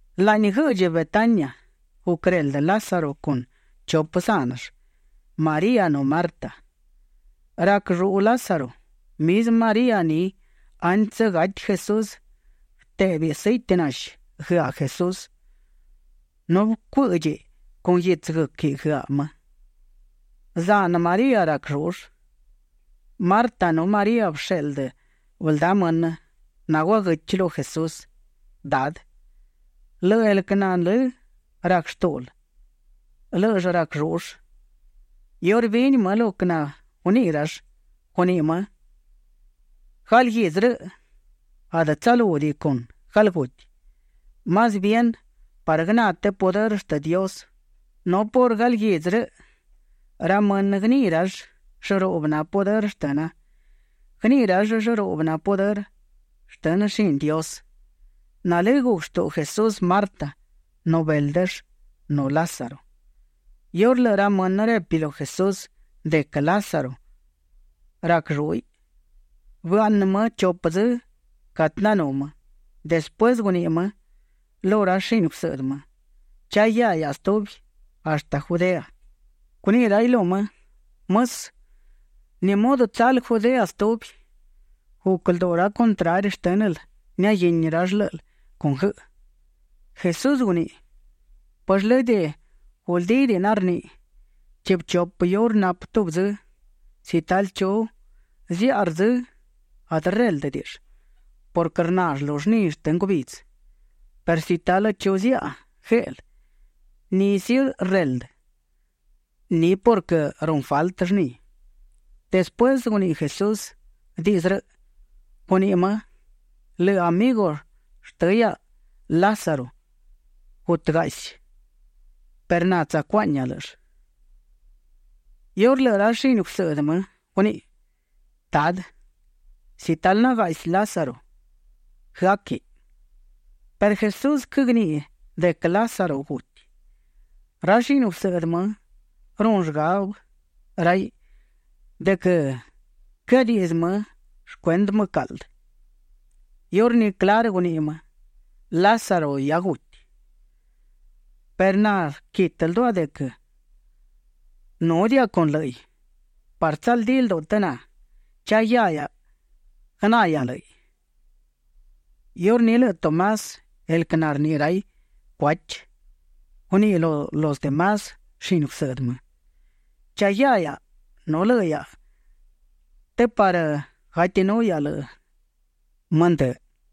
Laꞌni guëꞌdchi Betania guquëreldë Lázaro con chupë zánëll, María nu Marta. Rac lluꞌu Lázaro. Mizmë María ni antsë gati Jesús, bëtéꞌbëiꞌ sëiti nashi guëaꞌ Jesús nu bëcuë́ꞌdchiꞌ con guitsë guë́quiꞌ guëaꞌ më. Zanë María rac llúꞌull. Marta nu María bësheꞌldë bëldá mënë naguaguëchi lu Jesús: ―Dadë, lëꞌë el quë nalë́ rac shtúꞌul, lë́ꞌëll rac llúꞌull. Iurë bini më lo quë naguniꞌi rall, guniꞌi më: ―Galguidzë rëꞌ adë tsalúdiꞌi con galguti, más bien parë guëná të pudërë shtë Dios, nu por galguidzë rëꞌ ra mënë guëniꞌi rall llëruꞌbë na pudërë shtëna. Guëniꞌi rall llëruꞌbë na pudërë shtë shini Dios. Nalë́ guc shtuꞌu Jesús Marta nu béldëll nu Lázaro. Iurë lëꞌë ra mënë repi lu Jesús de quë Lázaro rac llúꞌiꞌ, bëaꞌnë më chupë dzë catë nanú më. Despuësë guniꞌi më lu ra shini gusëꞌdë më: ―Cha guiá hiaꞌa stubi hashtë Judea. Guniꞌi raiꞌ lu më: ―Mësë, ¿ni mudë tsal Judea stubi? Guc lduꞌu ra contrari shtë́nël niaguini rall lë́ꞌël con guëꞌë. Jesús guniꞌi: ―¿Pëllë lëdë guldídiꞌi narniꞌi: “Chiꞌbë chupë iurë napë tubi dzë”? Si talë chu ziaꞌa rdzë, adë rréldëdiꞌill purquë rnall lu llni shtë ngubidzë, perë si talë chu ziaꞌa gueꞌlë, ni sí, rreldë ni purquë runë faltë llni. Despuësë de guniꞌi Jesús diꞌdzë rëꞌ, guniꞌi më: ―Lëꞌë amigu shtë hiaꞌa, Lázaro, gutëgaꞌsi perë na tsacuaꞌñia lë́ꞌëll. Iurní lëꞌë ra shini gusëꞌdë më guniꞌi: ―Dadë, si talë nagaꞌsi Lázaro, guëáquiꞌ. Perë Jesús quëgniꞌi de quë Lázaro guti. Ra shini gusëꞌdë më runë shgabë raiꞌ de quë quëadiꞌdzë më shcuendë mbëcaꞌldë. Iurní clarë guniꞌi më: ―Lázaro hia guti perë na rquitë lduaꞌa de quë núdiaꞌa con lë́ꞌiꞌ parë tsaldí lduꞌu të na. Cha guiá guëná hiaꞌa lë́ꞌiꞌ. Iurní lëꞌë Tomás, el quë narniꞌi raiꞌ Cuachi, guníꞌiꞌ lu los de más shini gusëꞌdë më: ―Cha guiá hiaꞌa nu lëꞌë hiaꞌa të parë gatinú hiaꞌa lëꞌë më ndë.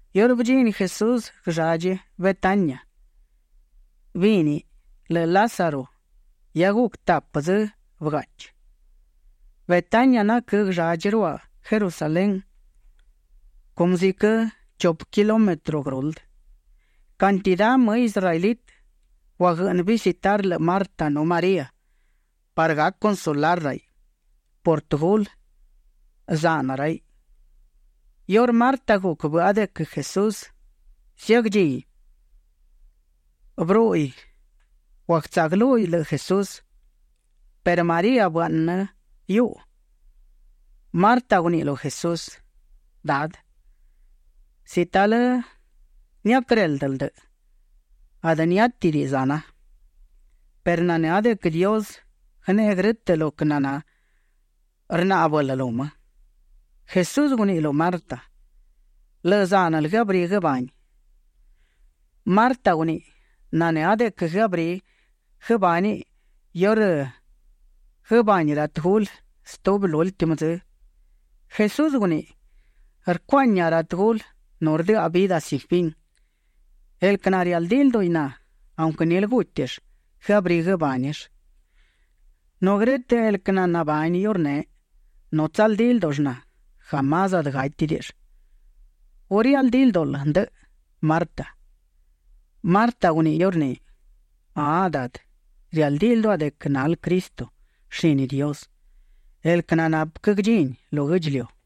Iurë bëdchini Jesús guëlladchi Betania, bíniꞌ lëꞌë Lázaro hia guc tapë dzë bëgáꞌchiꞌ. Betania naquë́ guëlladchi ruaꞌ Jerusalén cumë ziquë chupë kilómetro guëruldë. Cantidá më israelitë guaguëꞌnë visitar lëꞌë Marta nu María parë gac consolar raiꞌ por tëgulë, zanë raiꞌ. Iurë Marta guc bëꞌa de quë Jesús ziagdchini, bërúꞌuiꞌ; guagtsaꞌguëlúhiꞌ lëꞌë Jesús perë María bëaꞌnë hiuꞌu. Marta guniꞌi lu Jesús: ―Dadë, si talë niaquëréldël ndëꞌë, adë niátidiꞌi zana. Perë nanë́a de quë Dios guëneꞌe grë́tëꞌ lo quë naná rnáꞌbël lu më. Jesús guniꞌi lu Marta: ―Lëꞌë zánël guëabrí guëbániꞌ. Marta guniꞌi: ―Nanë́a de quë guëabrí guëbániꞌ iurë guëbani ra tëgulë stubi, lúltimë dzë. Jesús guniꞌi: ―Rcuaꞌñia ra tëgulë, nu rdëꞌa vidë sin fin. El quë narialdí lduꞌi na, aunquë nilë gútill, guëabrí guëbánill. Nu grë́tëꞌ el quë nanabani iurneꞌ nu tsaldí ldúꞌull na, jamás adë gátidiꞌill. ¿Gu rialdí ldúꞌul ndëꞌë, Marta? Marta guniꞌi iurní: ―Ahaꞌ Dadë, rialdí lduaꞌa de quë nal Cristo, shini Dios, el quë nanapë quë guëdchini lu guë́ꞌdchiliu.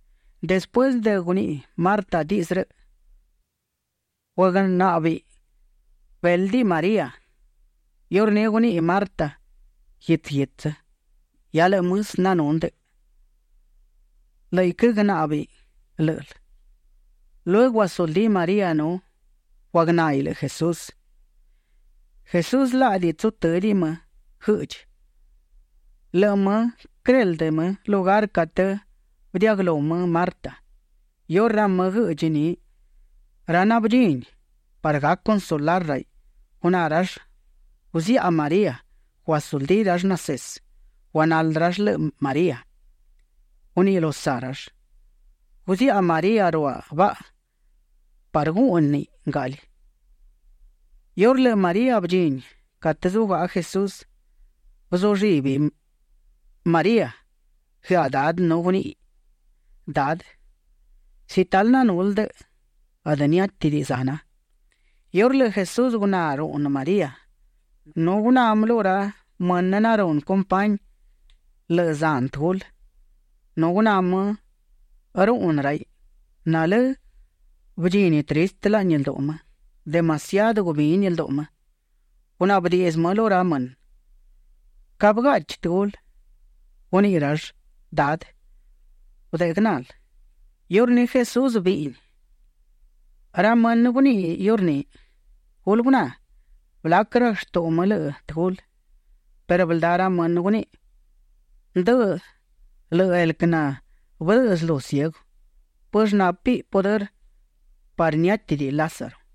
Despuësë de guniꞌi Marta diꞌdzë rëꞌ, guagnáꞌbëiꞌ béldiꞌ María. Iurní guniꞌi Marta guitsë guitsë: ―Hia lëꞌë mësë nanú ndëꞌë. Lë́ꞌiꞌ quëgnáꞌbëiꞌ lë́ꞌël. Lueguë guasuldí María nu guagnáhiꞌ lëꞌë Jesús. Jesús laꞌdi tsutë́diꞌi më guëꞌdchi. Lëꞌë më quëreldë më lugar catë bëdiaꞌguëlú më Marta. Iurë ra më guëꞌdchi ni, ra nabëdchini parë gac consolar raiꞌ, guná rall guziaꞌa María, guasuldí rall nasesë. Guagnaldë rall lëꞌë María; guniꞌi lu saꞌ rall: ―Guziaꞌa María ruaꞌ baꞌa parë gúꞌniꞌ ngaꞌli. Iurë lëꞌë María bëdchini catë zugaꞌa Jesús, bëzullibi María guëaꞌ Dadë nu guníꞌiꞌ: ―Dadë, si talë nanul ndëꞌë, adë niátidiꞌi zana. Iurë lëꞌë Jesús guná ruꞌnë María, nu guná më lu ra mënë narunë compañi lëꞌë zanë tëgulë, nu guná më ruꞌnë raiꞌ, nalë́ bëdchini tristë laꞌni lduꞌu më, demasiadë gubini lduꞌu më. Gunaꞌbë diꞌdzë më lu ra mënë: ―¿Ca bëgaꞌchi tëgulë? Guniꞌi rall: ―Dadë, gudeꞌe guënal. Iurní Jesús bíꞌniꞌ. Ra mënë guniꞌi iurní: ―Gulë guná, blac rac shtuꞌu më lëꞌë tëgulë. Perë bëldá ra mënë guniꞌi: ―Ndëꞌë lëꞌë el quë nabëdëꞌë slu ciegu, ¿pëllë nápiꞌ pudërë parë niátidiꞌi Lázaro?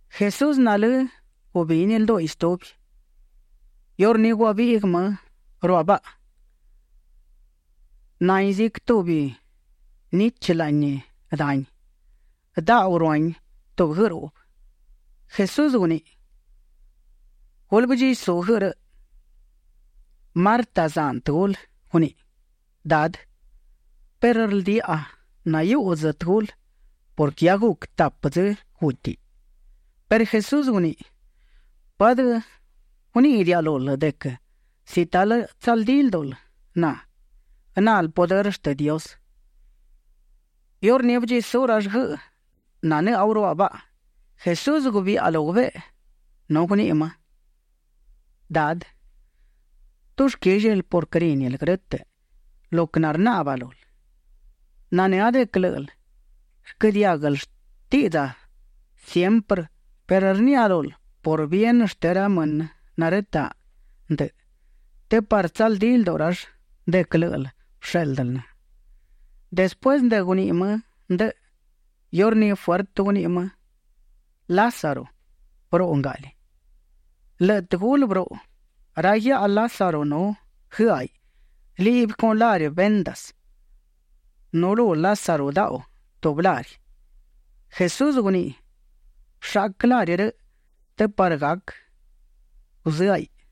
Jesús nalë́ gubini ldúꞌiꞌ stubi. Iurní guabiꞌguë më ruaꞌ baꞌa. Nahin ziquë tubi nichë laꞌni dani. Daꞌu ruahin tubi guëꞌë ruꞌbë. Jesús guniꞌi: ―Gulë bëdchisú guëꞌë rëꞌ. Marta, zanë tëgulë, guníꞌiꞌ: ―Dadë, perë rldiaꞌa nahiuꞌdzë tëgulë purquë hia guc tapë dzë gútiꞌ. Perë Jesús guniꞌi: ―¿Pë adë guníꞌidiaꞌa lul de quë si talë tsaldí ldúꞌul na, guënal pudërë shtë Dios? Iurní bëdchisú rall guëꞌë nananú ruaꞌ baꞌa. Jesús gubiꞌa lu gubeꞌe nu guniꞌi më: ―Dadë, dushquíllil purquë rínil grë́tëꞌ lo quë narnaꞌba lul. Nanë́a de quë lë́ꞌël rquë diáguël shtiꞌdza siemprë perë rniaꞌa lul por bien shtë ra mënë narëtaꞌ ndëꞌë të parë tsaldí lduꞌu rall de quë lë́ꞌël bëshéꞌldël na. Despuësë de guniꞌi më ndëꞌë, iurní fuertë guniꞌi më: ―Lázaro, bëruꞌu ngaꞌli. Lëꞌë tëgulë bëruꞌu. Ra guiaꞌa Lázaro nu guëáhiꞌ liꞌbi con lari vendas. Nu lu Lázaro daꞌu tubi lari. Jesús guniꞌi: ―Bëshaꞌquë lari rëꞌ të parë gac guzëáhiꞌ.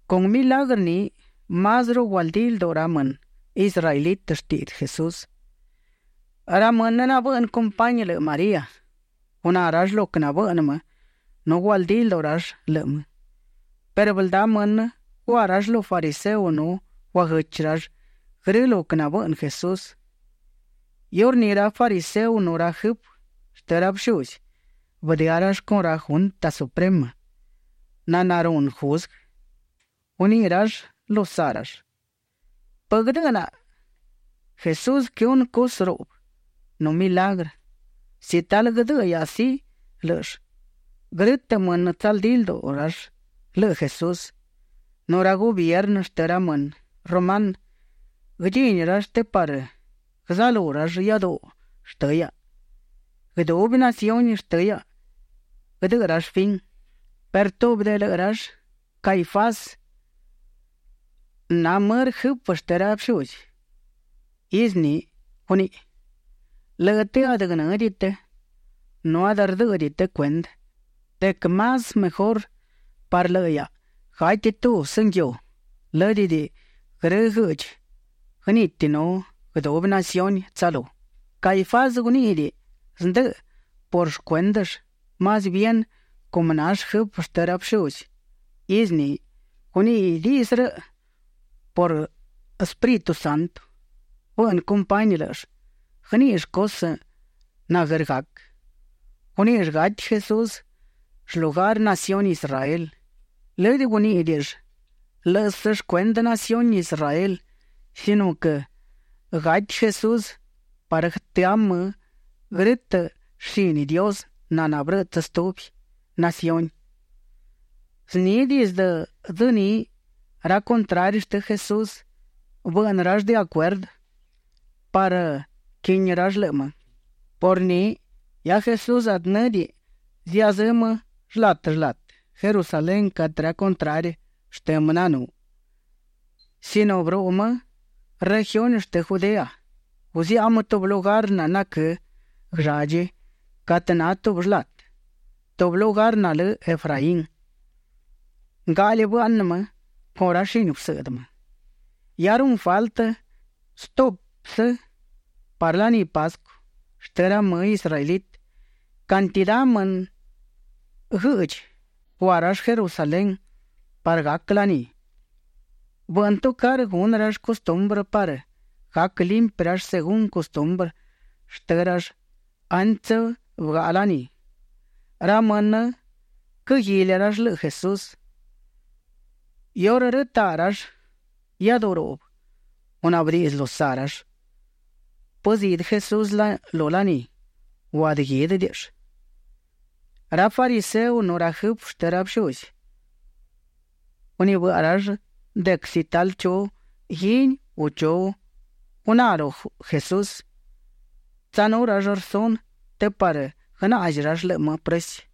Con milagrë ni másruꞌu gualdí lduꞌu ra mënë israelitë shtiꞌdzë Jesús, ra mënë nabëꞌnë compañi lëꞌë María. Guná rall lo quë nabëꞌnë më nu gualdí lduꞌu rall lëꞌë më. Perë bëldá mënë gua rall lu fariseo nu guaguëchi rall grë lo quë nabëꞌnë Jesús. Iurní ra fariseo nu ra jëfë shtë ra bëshuzi bëdëá rall con ra Junta Suprema naná runë juzguë. Guniꞌi rall lu saꞌ rall: ―¿Pë guëdë́ꞌnaꞌa? Jesús quëhunë cusë ruꞌbë nu milagrë. Si talë guëdëꞌë hiaꞌa sí lë́ꞌëll, grë́tëꞌ mënë tsaldí lduꞌu rall lëꞌë Jesús, nu ra gubiernë shtë ra mënë rumanë guëdchini rall të parë guëzalú rall iáduꞌu shtë hiaꞌa. Guëdubi naciuni shtë hiaꞌa guëdëꞌë rall fin. Perë tubi de lëꞌë rall, Caifás, nall mërë jëfë shtë ra bëshuzi izë ni; guníꞌiꞌ: ―Lëꞌë të adë guënë́diꞌi të nu adë rdë́ꞌëdiꞌi të cuendë de quë más mejurë parë lëꞌë hiaꞌa, gati tubsë nguiu, lë́dëdiꞌi grë guëꞌdchi guëniti nu guëdubi naciuni tsalú. Caifás guníꞌidiꞌi zndëꞌë por shcuéndëll; más bien cumë nall jëfë shtë ra bëshuzi izë ni, guníꞌiꞌ diꞌdzë rëꞌ purquë el Espíritu Santo bëꞌnë compañi lë́ꞌëll guëníꞌill cusë naguër gac. Guníꞌill gati Jesús shlugar naciuni Israel. Lëdë guníꞌidiꞌill lë́ꞌësë shcuendë naciuni Israel sino quë gati Jesús parë guëtëá më grë́tëꞌ shini Dios naná bërëꞌtsë stubi naciuni. Zni dizdë dzë ni, ra contrari shtë Jesús bëꞌnë rall de acuerdë parë quini rall lëꞌë më. Por ni hia Jesús adë në́diꞌiꞌ ziazë́ më shlatë shlatë Jerusalén catë ra contrari shtë më nanú, sino bëruꞌu më regiuni shtë Judea. Guziaꞌa më tubi lugar naquë́ guëlladchi catë na tubi shlatë, tubi lugar nalë Efraín. Ngaꞌli bëaꞌnë më con ra shini gusëꞌdë më. Hia runë faltë stuꞌpsë parë laní Pascu shtë ra mënë israelitë. Cantidá mënë guëꞌdchi gua rall Jerusalén parë gac laní. Bëꞌnë tucarë gunë rall custumbrë parë gac limpi rall según custumbrë shtë rall antsë bëgaꞌa laní. Ra mënë quëguili rall lëꞌë Jesús. Iurë rëtaꞌ rall iáduꞌu ruꞌbë, gunaꞌbë diꞌdzë lu saꞌ rall: ―¿Pë zidë Jesús lu laní u adë guídëdiꞌill? Ra fariseo nu ra jëfë shtë ra bëshuzi gunibëꞌa rall de quë si talë chu guini u chu guná lu Jesús, tsanú rall rsunë të parë guënaꞌzi rall lëꞌë më prësi.